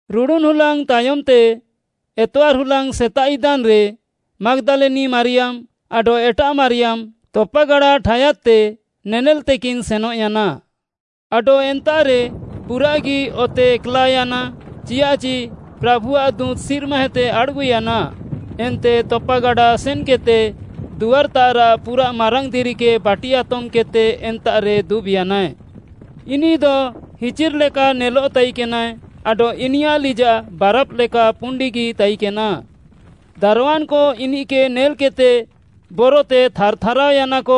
ରୁଡ଼ୁନ୍‌ ହୁଲାଙ୍ଗ୍‌ ତାୟମ୍‌ତେ, ଏତଆର୍‌ ହୁଲାଙ୍ଗ୍‌ ସେତାଃ ଇଦାନ୍‌ରେ ମାଗ୍‌ଦାଲିନି ମାରିୟାମ୍‌ ଆଡଃ ଏଟାଃ ମାରିୟାମ୍‌ ତପାଗାଡ଼ା ଠାୟାଦ୍‌ତେ ନେନେଲ୍‌ତେକିନ୍‌ ସେନଃୟାନା। ଆଡଃ ଏନ୍ତାଃରେ ପୁରାଃଗି ଅତେ ଏକ୍‌ଲାଅୟାନା ଚିୟାଃଚି ପ୍ରାଭୁଆଃ ଦୁଁତ୍‌ ସିର୍ମାଏତେ ଆଡ଼୍‌ଗୁୟାନା ଏନ୍ତେ ତପାଗାଡ଼ା ସେନ୍‌କେଦ୍‌ତେ ଦୁଆର୍‍ତାଃରାଃ ପୁରାଃ ମାରାଙ୍ଗ୍‌ ଦିରିକେ ବାଟି ଆତମ୍‌କେଦ୍‌ତେ ଏନାରେ ଦୁବ୍‍ୟାନାଏ। ଇନିଃଦ ହିଚିର୍‍ ଲେକା ନେଲଃ ତାଇକେନାଏ ଆଡଃ ଇନିୟାଃ ଲିଜାଃ ବାରାଫ୍‌ ଲେକା ପୁଣ୍ଡିଗି ତାଇକେନା। ଦାରୱାନ୍‌କ ଇନିଃକେ ନେଲ୍‌କେଦ୍‌ତେ ବରତେ ଥାର୍‌ଥାରାଅୟାନାକ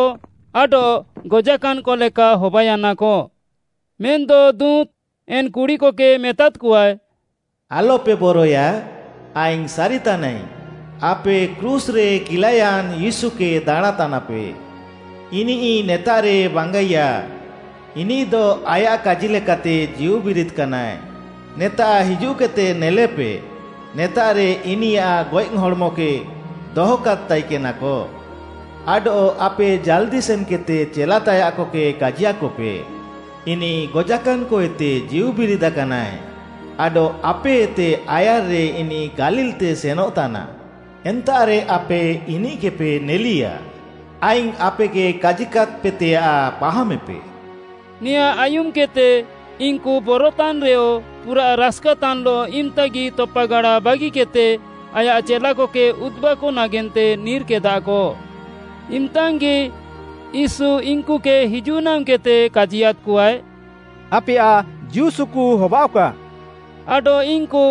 ଆଡଃ ଗଜାକାନ୍‍କ ଲେକା ହବାୟାନାକ। ମେନ୍‌ଦ ଦୁଁତ୍‌ ଏନ୍‌ କୁଡ଼ିକକେ ମେତାଦ୍‌କଆଏ, “ଆଲ୍‌ପେ ବରଏୟା। ଆଇଙ୍ଗ୍‌ ସାରିତାନାଇଙ୍ଗ୍‌ ଆପେ କ୍ରୁଶ୍‌ରେ କିଲାୟାନ୍ ୟୀଶୁକେ ଦାଣାଁଁତାନାପେ। ଇନିଃ ନେତାଃରେ ବାଙ୍ଗାଇୟା ଇନିଃଦ ଆୟାଃ କାଜିଲେକାତେ ଜୀଉବିରିଦାକାନାଏ। ନେତାଃ ହିଜୁଃକେଦ୍‌ତେ ନେଲେପେ, ନେତାଃରେ ଇନିୟାଃ ଗଏଃ ହଡ଼୍‌ମକେ ଦହକାଦ୍‌ ତାଇକେନାକ। ଆଡଃ ଆପେ ଜାଲ୍‍ଦି ସେନ୍‌କେଦ୍‌ତେ ଚେଲା ତାୟାଃକକେ କାଜିୟାକପେ, ‘ଇନିଃ ଗଜାକାନ୍‍କଏତେ ଜୀଉବିରିଦାକାନାଏ, ଆଡଃ ଆପେଏତେ ଆୟାର୍‌ରେ ଇନିଃ ଗାଲିଲ୍‌ତେ ସେନଃତାନା। ଏନ୍ତାଃରେ ଆପେ ଇନିଃକେପେ ନେଲିୟା।’ ଆଇଙ୍ଗ୍‌ ଆପେକେ କାଜିକାଦ୍‌ପେତେୟାଃ ପାହାମେପେ।” ନେଆଁଁ ଆୟୁମ୍‌କେଦ୍‌ତେ ଇନ୍‌କୁ ବରତାନ୍‍ରେୟ ପୁରାଃ ରାସ୍‌କାତାନ୍‌ଲଃ ଇମ୍‌ତାଗି ତପାଗାଡ଼ା ବାଗିକେଦ୍‌ତେ ଆୟାଃ ଚେଲାକକେ ଉଦ୍‌ବାକ ନାଗେନ୍ତେ ନିର୍‌କେଦାକ। ଇମ୍‌ତାଙ୍ଗ୍‌ଗି ୟୀଶୁ ଇନ୍‌କୁକେ ହିଜୁଃନାମ୍‌କେଦ୍‌ତେ କାଜିୟାଦ୍‍କଆଏ, “ଆପେୟାଃ ଜୀଉସୁକୁ ହବାଅଃକା” ଆଡଃ ଇନ୍‌କୁ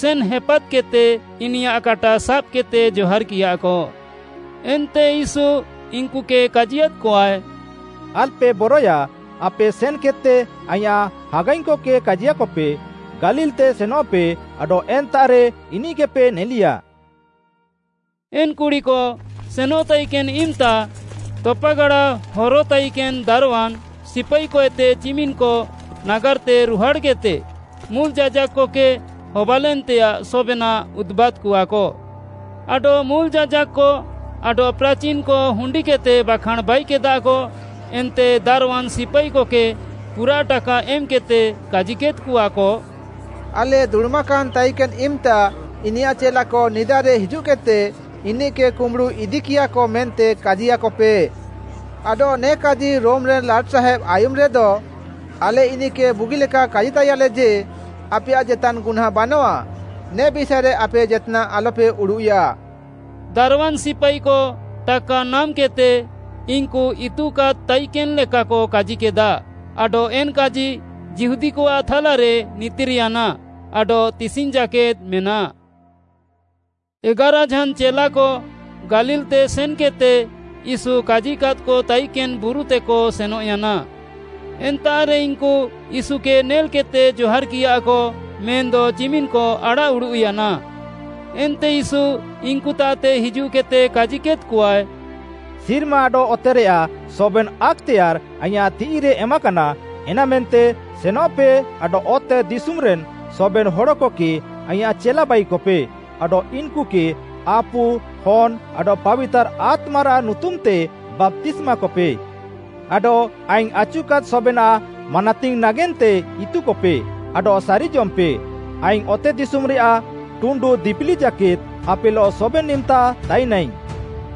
ସେନ୍‌ ହେପାଦ୍‍କେଦ୍‍ତେ ଇନିୟାଃ କାଟା ସାବ୍‌କେଦ୍‌ତେ ଜହାର୍‌କିୟାକ। ଏନ୍ତେ ୟୀଶୁ ଇନ୍‌କୁକେ କାଜିୟାଦ୍‍କଆଏ, “ଆଲ୍‌ପେ ବରଏୟା, ଆପେ ସେନ୍‌କେଦ୍‌ତେ ଆଇଁୟାଃ ହାଗାଇଙ୍ଗ୍‌କକେ କାଜିୟାକପେ, ଗାଲିଲ୍‌ତେ ସେନଃପେ ଆଡଃ ଏନ୍ତାଃରେ ଇନିଃକେପେ ନେଲିୟା।” ଏନ୍‌ କୁଡ଼ିକ ସେନଃତାଇକେନ୍ ଇମ୍‌ତା, ତପାଗାଡ଼ା ହରତାଇକେନ୍‌ ଦାରୱାନ୍‌ ସିପାଇକଏତେ ଚିମିନ୍‍କ ନାଗାର୍‌ତେ ରୁହାଡ଼୍‌କେଦ୍‌ତେ ମୁଲ୍‌ ଯାଜାକ୍‌କକେ ହବାଲେନ୍‌ତେୟାଃ ସବେନାଃ ଉଦୁବାଦ୍‌କଆକ। ଆଡଃ ମୁଲ୍‌ ଯାଜାକ୍‌କ ଆଡଃ ପ୍ରାଚିନ୍‌କ ହୁଣ୍ଡିକେଦ୍‌ତେ ବାଖାଁଣ୍‌ ବାଇକେଦାକ ଏନ୍ତେ ଦାରୱାନ୍‌ ସିପାଇକକେ ପୁରାଃ ଟାକା ଏମ୍‌କେଦ୍‌ତେ, କାଜିକେଦ୍‌କଆକ, “ଆଲେ ଦୁଡ଼ୁମାକାନ୍‌ ତାଇକେନ୍‌ ଇମ୍‌ତା ଇନିୟାଃ ଚେଲାକ ନିଦାରେ ହିଜୁଃକେଦ୍‌ତେ ଇନିଃକେ କୁମ୍ବୁଡ଼ୁ ଇଦିକିୟାକ ମେନ୍ତେ କାଜିୟାକପେ। ଆଡଃ ନେ କାଜି ରୋମିରେନ୍‌ ଲାଟ୍‌ସାହେବ୍‌ ଆୟୁମେରେଦ ଆଲେ ଇନିଃକେ ବୁଗିଲେକା କାଜିତାଇୟାଲେ ଯେ, ଆପେୟାଃ ଜେତାନ୍‌ ଗୁହ୍ନାଁ ବାନଆଃ। ନେ ବିଷାଏରେ ଆପେ ଜେତ୍‌ନାଃ ଆଲ୍‌ପେ ଉଡ଼ୁଃୟା।” ଦାରୱାନ୍‌ ସିପାଇକ ଟାକା ନାମ୍‌କେଦ୍‌ତେ ଇନ୍‌କୁ ଇତୁକାଦ୍‌କ ତାଇକେନ୍‌ ଲେକାକ କାଜିକେଦା ଆଡଃ ଏନ୍‍ କାଜି ଯିହୁଦୀକଆଃ ଥାଲାରେ ନିତିର୍‌ୟାନା ଆଡଃ ତିସିଙ୍ଗ୍‌ ଜାକେଦ୍‌ ମେନାଃ। ଏଗାରାଝାନ୍‌ ଚେଲାକ ଗାଲିଲ୍‌ତେ ସେନ୍‌କେଦ୍‌ତେ ୟୀଶୁ କାଜିକାଦ୍‌କ ତାଇକେନ୍‌ ବୁରୁତେକ ସେନଃୟାନା। ଏନ୍ତାଃରେ ଇନ୍‌କୁ ୟୀଶୁକେ ନେଲ୍‍କେଦ୍‍ତେ ଜହାର୍‌କିୟାକ ମେନ୍‌ଦ ଚିମିନ୍‍କ ଆଡ଼ାଃଉଡ଼ୁଃୟାନା। ଏନ୍ତେ ୟୀଶୁ ଇନ୍‍କୁତାଃତେ ହିଜୁଃକେଦ୍‌ତେ କାଜିକେଦ୍‌କଆଏ, “ସିର୍ମା ଆଡଃ ଅତେରେୟାଃ ସବେନ୍‌ ଆକ୍‌ତେୟାର୍‌ ଆଇଁୟାଃ ତିଃଇରେ ଏମାକାନା, ଏନାମେନ୍ତେ ସେନଃପେ ଆଡଃ ଅତେଦିଶୁମ୍‌ରେନ୍‌ ସବେନ୍‌ ହଡ଼କକେ ଆଇଁୟାଃ ଚେଲା ବାଇକପେ ଆଡଃ ଇନ୍‌କୁକେ ଆପୁ, ହନ୍‌ ଆଡଃ ପାବିତାର୍‌ ଆତ୍ମାରାଃ ନୁତୁମ୍‌ତେ ବାପ୍ତିସ୍ମାକପେ। ଆଡଃ ଆଇଙ୍ଗ୍‌ ଆଚୁକାଦ୍‌ ସବେନାଃ ମାନାତିଙ୍ଗ୍‌ ନାଗେନ୍ତେ ଇତୁକପେ ଆଡଃ ସାରିଜମେପେ, ଆଇଙ୍ଗ୍‌ ଅତେଦିଶୁମ୍‌ରେୟାଃ ଟୁଣ୍ଡୁ ଦିପିଲି ଜାକେଦ୍‌ ଆପେଲଃ ସବେନ୍‌ଇମ୍‌ତା ତାଇନାଇଙ୍ଗ୍‌।”